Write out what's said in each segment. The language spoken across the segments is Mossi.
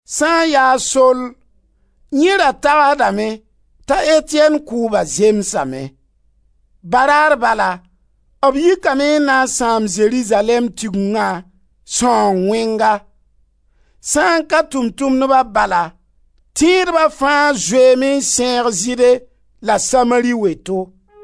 Sã n ya a Sol, yẽ ra tagsdame t'a Etiyɛn kʋʋba zemsame. Baraar bala b yikame n na n sãam Zerizalɛɛm Tigengã sãoong wẽnga. Sã n ka Tʋʋm-tʋmdba bala, tẽedba fãa zoeeme n sẽeg Zɩɩde la Samari weto.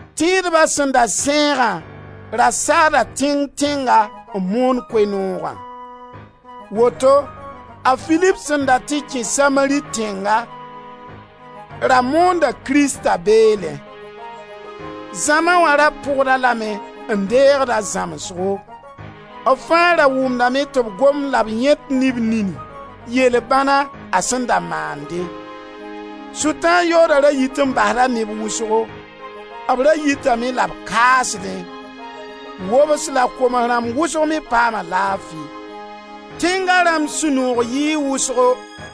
Tẽedba sẽn da sẽegã ra saada tẽng-tẽnga n moon Koe-noogã. Woto a Filip sẽn da tɩ kẽ Samari tẽnga ra moonda Krista beelẽ. Zãma wã ra pʋgda lame n deegd a zãmsgo. B fãa ra wʋmdame tɩ b gomd la b yãet ne b nini, yel-bãna a sẽn da maande. Sʋtãan yooda ra yit n basda neb wʋsgo. B ra yitame la b kaasdẽ. Wobs la koms-rãmb wʋsg me paama laafi. Tẽnga rãmb sũ-noog yɩɩ wʋsgo.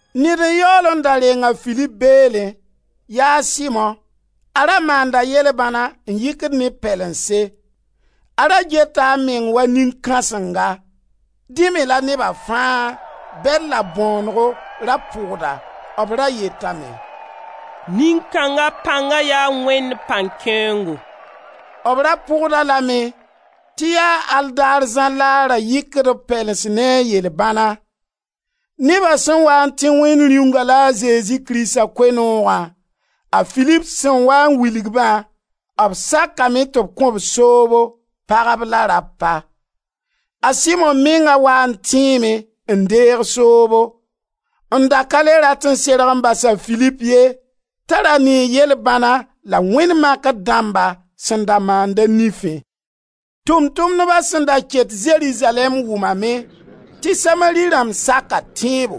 Ned n yaool n da reng a Filip beelẽ. Yaa a Simo. A ra maanda yel-bãna n yɩkd neb pɛlense. A ra geta a meng wa nin-kãsenga. Dẽ me la neba fãa, bɛd la bõonego, ra pʋgd-a. B ra yetame: «Nin-kãnga pãnga yaa Wẽnd pãn-kẽoongo.» B ra pʋgd-a lame tɩ yaa al daar zãr la a ra yɩkd b pɛlens ne a yel-bãna. Neba sẽn waa n tẽ Wẽnd Rĩunga la a Zezi Krista Koe-noogã, a Filip sẽn waa n wilg-bã, b sakame tɩ b kõ-b soobo, pagb la rapa. A Simo menga waa n tẽeme n deeg soobo, n da ka le rat n serg n bas a Filip ye t'a ra nee yel-bãna la wẽnd makr dãmba sẽn da maand a nifẽ. Tʋʋm-tʋmdba sẽn da ket Zerizalɛɛm wʋmame tɩ Samari rãmb saka tẽebo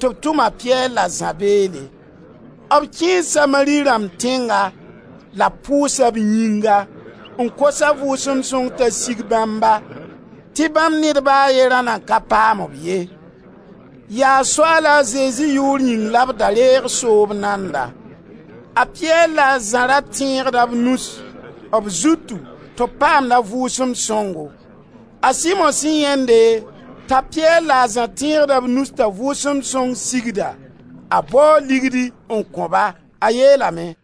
tɩ b tʋm a Piyɛr la a Zã beelẽ. B kẽe Samari rãmb tẽnga la b pʋʋsa b yĩnga, n kos a Vʋʋsem Sõng t'a sig bãmba, tɩ bãmb ned ba a ye ra nan ka paam-b ye. Yaa Soaala Zezi yʋʋr yĩng la da reeg soob nanda. A Piyɛr la a Zã ra tẽegda b nus b zutu tɩ b paamd a Vʋʋsem Sõngo. A Simo sẽn yãende t'a Piyɛr la a Zã tẽegda b nus t'a Vʋʋsem Sõng sigda, a bao ligdi n kõ-ba. A yeelame: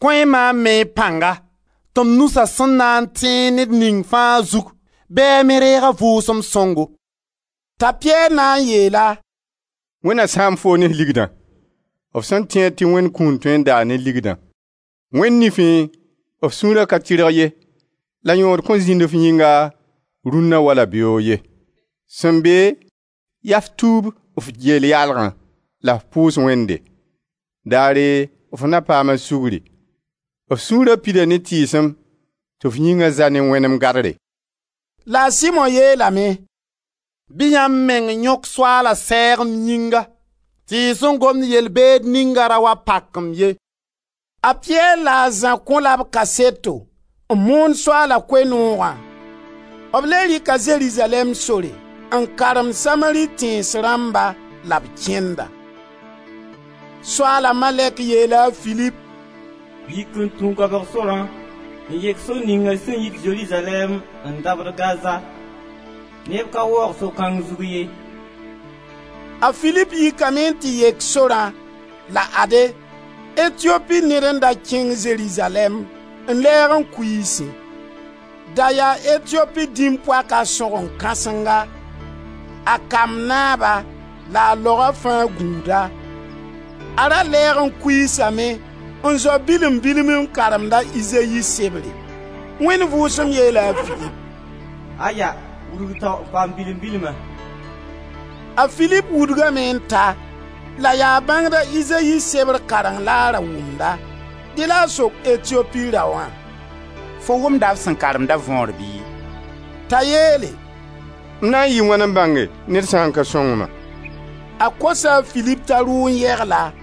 «Kõ-y maam me y pãngã tɩ m nusa sẽn na n tẽeg ned ning fãa zugu bɩ a me reeg a Vʋʋsem sõngo.» T'a Piyɛr na n yeel-a: «Wẽnd na sãam foo ne f ligdã, f sẽn tẽed tɩ Wẽnd kũun tõe n daa ne ligdã! Wẽnd nifẽ, f sũura ka tɩrg ye la yõod kõn zĩnd f yĩnga, rũnna wala beoog ye. Sẽn be, yaa f tuub f geel yaalgã la f pʋʋs Wẽnde. Daare f na paam a sugri. F sũura pida ne tɩɩsem tɩ f yĩnga za ne wẽnem gadre.» La a Simo yeelame: «Bɩ yãmb meng yõk Soaala sɛɛg m yĩnga, tɩ y sẽn gomd yel-beed ninga ra wa pak-m ye.» A Piyɛr la a Zã kõ-la b kaseto, n moon Soaala Koe-noogã. B le rɩka Zerizalɛɛm sore, n karemd Samari tẽns rãmba, la b kẽnda. Soaala malɛk yeela a Filip: «Yik n tũ goabg sorã n yek sor ninga sẽn yit Zerizalɛɛm n dabd Gaza. Neb ka waoog so-kãng zug ye.» A Filip yikame n tɩ yek sorã. La ade, Etiopi ned n da kẽng Zerizalɛɛm n lɛɛg n kuiisẽ. Da yaa Etiopi dĩm-poaka sõgen kãsenga, a kamb naaba la a laoga fãa gũuda. A ra lɛɛg kuiisame, n zao bilim-bilm n karemd a Izayi sebre. Wẽnd Vʋʋsem yeela a Filip: «Aya! Wudg tao n paam bilim-bilma.» A Filip wudgame n ta, la yaa bãngd a Izayi sebr kareng la a ra wʋmda. Dẽ la a sok Etiopi raoã: «Fo wʋmda f sẽn karemda võor bɩ?» T'a yeele: «M na n yɩɩ wãn n bãnge ned sã n ka sõng-ma?» A kosa a Filip t'a rʋ n yegl-a.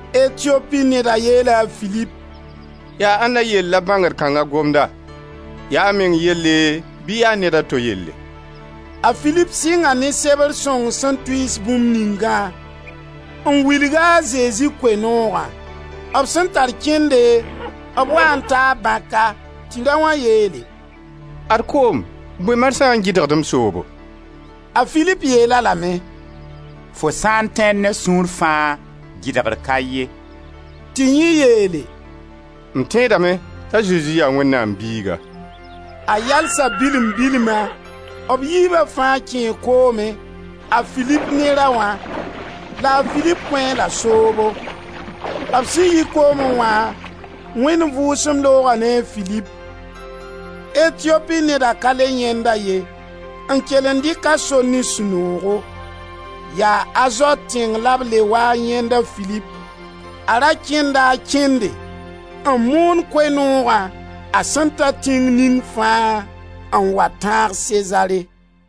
Etiopi neda yeela a Filip: «Yaa ãnda yell la bãngd kãnga gomda, yaa meng yelle bɩ yaa ned a to yelle?» A Filip sɩnga ne Sebr sõng sẽn tʋɩɩs bũmb ningã n wilg-a a Zezi Koe-noogã. B sẽn tar kẽnde b waa n taa bãka tɩ raoã yeele: «Ad koom! Bõe marsã n gɩdgd m soobo?» [ A Filip yeel-a lame: «Fo sã n tẽed ne f sũur fãa, gɩdgr ka ye!» Tɩ yẽ yeele: «M tẽedame t'a Zezi yaa Wẽnnaam Biiga.»] A yalsa bilm bilma. B yiiba fãa kẽe koomẽ, a Filip ne raoã, la a Filip kõ-a-la soobo. B sẽn yi koomẽ wã Wẽnd Vʋʋsem looga ne a Filip. Etiopi neda ka le yãend-a ye, n kel n dɩk a sor ne sũ-noogo. Yaa Azot tẽng la b le wa yãend a Filip. A ra kẽnda a kẽnde n moon Koe-noogã a sẽn ta tẽng ning fãa, n wa tãag Sezare.